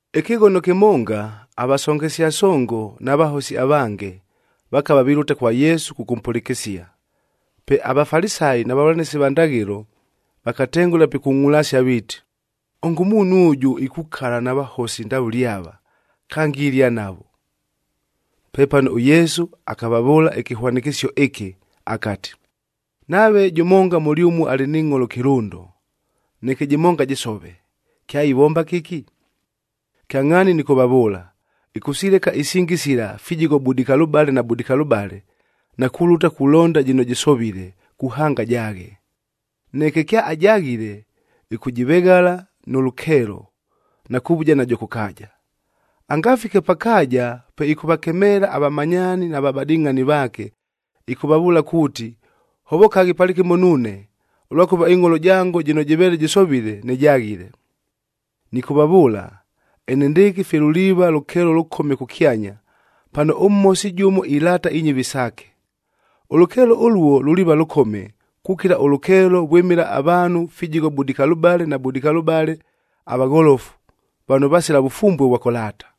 Ɨkɨghono kɨmonga, avasongesia songo na vahosi avange, vakava vilʉta kwa Yesu kʉkʉmpʉlɨkɨsia. Pe aVafalisayi na vavʉlanɨsi va ndaghɨlo, vakatengʉla pikungʼulasia viiti, “Ongo ʉmuunhu ʉjʉ, ikukala na vahosi ndavʉle ava! Kange ilia navo!” Pepano ʉYesu akavavʉʉla ɨkɨhwanɨkɨsio ɨkɨ akati, “Nave jʉmonga mʉlyʉmue alɨ ni ngʼholo kɨlʉndo, neke jɨmonga jɨsove, kyaivomba kɨki? Kyangʼhaani nɨkʉvavʉʉla, ɨkʉsileka isingi sila fijigho budikalʉbale na budikalʉbale, na kulʉta kulonda jɨno jɨsovile, kuhanga ajaaghe. Neke kyaajaghile, ɨkʉjɨveghala nʉ lʉkeelo, na kuvuja najo kʉ kaaja. Angafike pa kaaja, pe ɨkʉvakemeela avamanyaani na vabadɨngʼhani vaake, ɨkʉvavʉʉla kuuti, ‘Hovokaghi palɨkɨmo nuune, ʉlwakʉva ɨngʼholo jango jɨno jɨveele jɨsovile, nɨjaghile!’ “Nɨkʉvavʉʉla, enendɨɨkɨ fye luliiva lʉkeelo lʉkome kʉkyanya, pano ʉmhosi jʉmo ilaata inyɨvi saake. Ʉlʉkeelo ʉluo luliiva lʉkome, kukila ʉlʉkeelo vwɨmɨla avaanhu fijigho budikalʉbale na budikalʉbale avagholofu, vano vasila vʉfumbue ʉvwa kʉlaata.”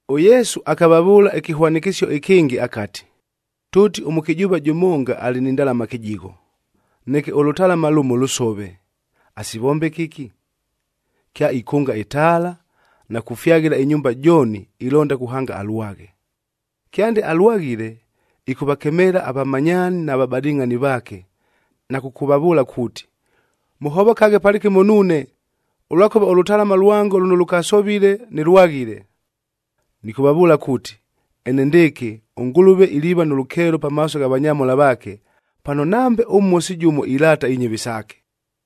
ɄYesu akavavʉʉla ɨkɨhwanɨkɨsio ɨkɨngɨ akati, “Tʉʉti ʉmʉkɨjʉʉva jʉmonga alɨ ni ndalama kɨjigho, neke ʉlʉtalama lʉmoa lʉsove, asivombe kɨki? Kyaikʉnga ɨtaala, na kufyaghɨla ɨnyumba jooni, ilonda kuhanga alwaghe. Kyande alwaghile, ɨkʉvakemeela avamanyaani na vabadɨngʼhani vaake, na kʉkʉvavʉʉla kuuti, ‘Mʉhovokaghe palɨkɨmo nuune, ʉlwakʉva ʉlʉtalama lwango lʉno lʉkasovile, nɨlwaghile!’ “Nɨkʉvavʉʉla kuuti, enendɨɨkɨ ʉNgʉlʉve iliiva nʉ lʉkeelo pamaaso gha vanyamhola vaake, pano nambe ʉmhosi jʉmo ilaata inyɨvi saake.”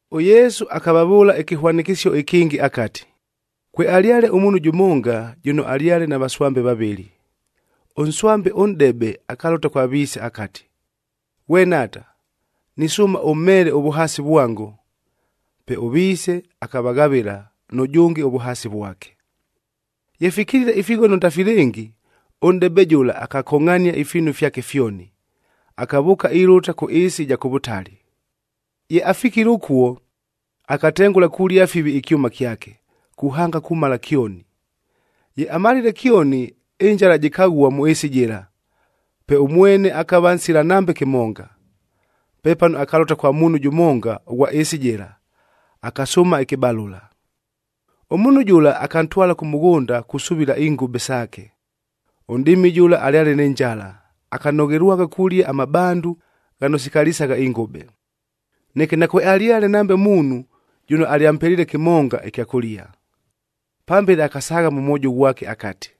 ɄYesu akavavʉʉla ɨkɨhwanɨkɨsio ɨkɨngɨ akati, “Kwealyale ʉmuunhu jʉmonga, jʉno alyale na vaswambe vavɨlɨ. Ʉnswambe ʉnʼdebe, akalʉta kwa viise akati, ‘Ghwe nhaata, nisʉʉma ʉmheele ʉvʉhaasi vwango.’ Pe ʉviise akavaghavɨla, nʉjʉnge ʉvʉhaasi vwake. “Ye fikilile ifighono ndafilɨngi, ʉnʼdebe jʉla akakongʼhania ifiinu fyake fyoni, akavʉʉka ilʉta kʉ ɨɨsi ɨja kʉ vʉtali. Ye afikile ʉkuo, akatengʉla kulia fivi ɨkyʉma kyake, kuhanga kumala kyoni. Ye amalile kyoni, ɨnjala jɨkaghua mʉ ɨɨsi jɨla, pe ʉmwene akava nsila nambe kɨmonga. Pepano, akalʉta kwa muunhu jʉmonga ʉghwa ɨɨsi jɨla, akasʉʉma ɨkɨbalʉla. Ʉmuunhu jʉla, akantwala kʉ mʉghʉnda kusuvila ingʉbeb saake. Ʉnʼdɨɨmi jʉla alyale nɨ njala, akanoghelwagha kulia amabandu ghano sikalisagha ingʉbe. Neke nakwealyale nambe muunhu, jʉno alyampeliile kɨmonga ɨkya kʉlia. “Pambele akasaagha mʉ mwojo ghwake akati,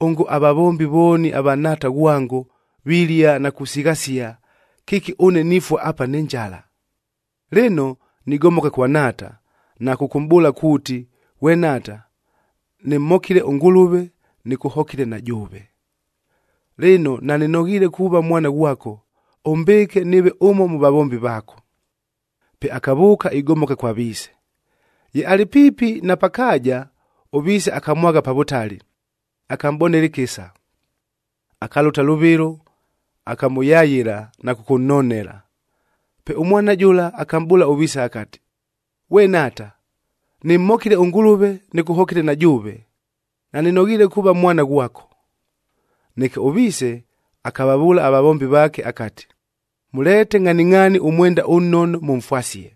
‘Ongo avavombi vooni ava nhaata ghwango, vilia na kusighasia, kɨki ʉne nifua apa nɨ njala! Lɨno, nigomoka kwa nhaata, na kʉkʉmʼbʉʉla kuuti, “Ghwe nhaata, nɨmhokile ʉNgʉlʉve, nɨkʉhokile na jʉʉve. Lɨno, nanɨnoghiile kuuva mwana ghwako, ʉmbɨɨke nɨɨve ʉmo mʉ vavombi vaako.” ’ “Pe akavʉʉka igomoka kwa viise. Ye alɨ piipi na pa kaaja, ʉviise akamwagha pa vʉtali, akamʼbonela ɨkɨsa. Akalʉta lʉvɨlo, akamʉyayɨla na kʉkʉnnonela. Pe ʉmwana jʉla, akamʼbʉʉla ʉviise akati, ‘Ghwe nhaata, nɨmhokile ʉNgʉlʉve, nɨkʉhokile na jʉʉve. Nanɨnoghiile kuuva mwana ghwako.’ “Neke ʉviise akavavʉʉla avavombi vaake akati, ‘Mʉleete ngʼhaningʼhaani ʉmwenda ʉnnono mʉmfwasie.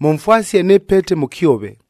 Mʉmfwasie nɨ pete mʉ kyove,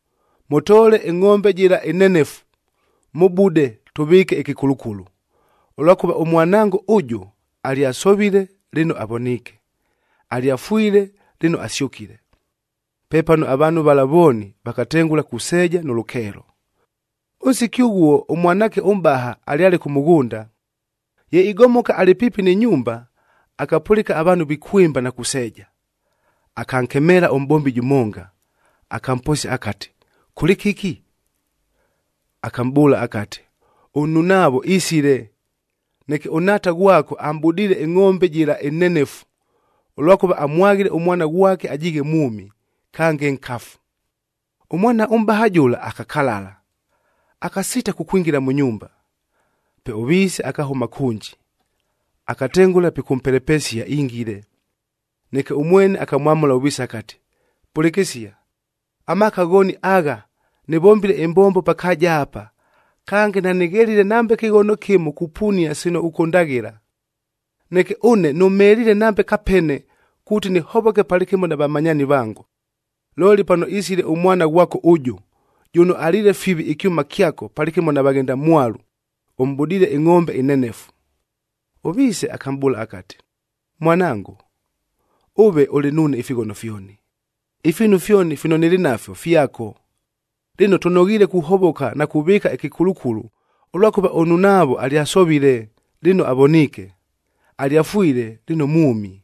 Mʉtoole ɨngʼombe jɨla ɨnenefu, mʉbude, tʉvɨɨke ɨkɨkulukulu, ʉlwakʉva ʉmwanango ʉjʉ, alyasovile, lɨno avoniike; alyafwile, lɨno asyʉkile!’ Pepano avaanhu vala vooni vakatengʉla kuseeja nʉ lʉkeelo. “Ʉnsiki ʉghuo, ʉmwanaake ʉmʼbaha alyale kʉ mʉghʉnda. Ye igomoka alɨ piipi nɨ nyumba, akapʉlɨka avaanhu vikwɨmba na kuseeja. Akankemeela ʉmʼbombi jʉmonga, akamposia akati, ‘Kʉlɨ kɨki?’ Akamʼbʉʉla akati, ‘Ʉnnunaavo isile, neke ʉnhaata ghwako amʼbudiile ɨngʼombe jɨla ɨnenefu, ʉlwakʉva amwaghile ʉmwana ghwake ajiighe mwʉmi, kange nkafu.’ Ʉmwana ʉmʼbaha jʉla akakalala, akasiita kukwingila mʉ nyumba. Pe ʉviise akahʉma kʉnji, akatengʉla pikʉmpelepesia ingile. Neke ʉmwene akamwamʉla ʉviise akati, ‘Pʉlɨkɨsia! Amaaka ghooni agha nɨvombile ɨmbombo pa kaaja apa, kange nanɨghelile nambe kɨghono kɨmo kupunia sino ʉkʉndaghɨla! Neke ʉne nʉmheliile nambe kapene, kuuti nɨhovoke palɨkɨmo na vamanyaani vango. Looli pano isile ʉmwana ghwako ʉjʉ, jʉno aliile fivi ɨkyʉma kyako palɨkɨmo na vaghendamwalu, ʉmʼbudiile ɨngʼombe ɨnenefu!’ “Ʉviise akamʼbʉʉla akati, ‘Mwanango, ʉve ʉlɨ nuune ifighono fyoni, ifiinu fyoni fino nɨlɨ nafyo fyako. Lɨno, tʉnoghiile kuhovoka na kuvɨɨka ɨkɨkulukulu, ʉlwakʉva ʉnnunaavo alyasovile, lɨno avoniike; alyafwile, lɨno mwʉmi!’”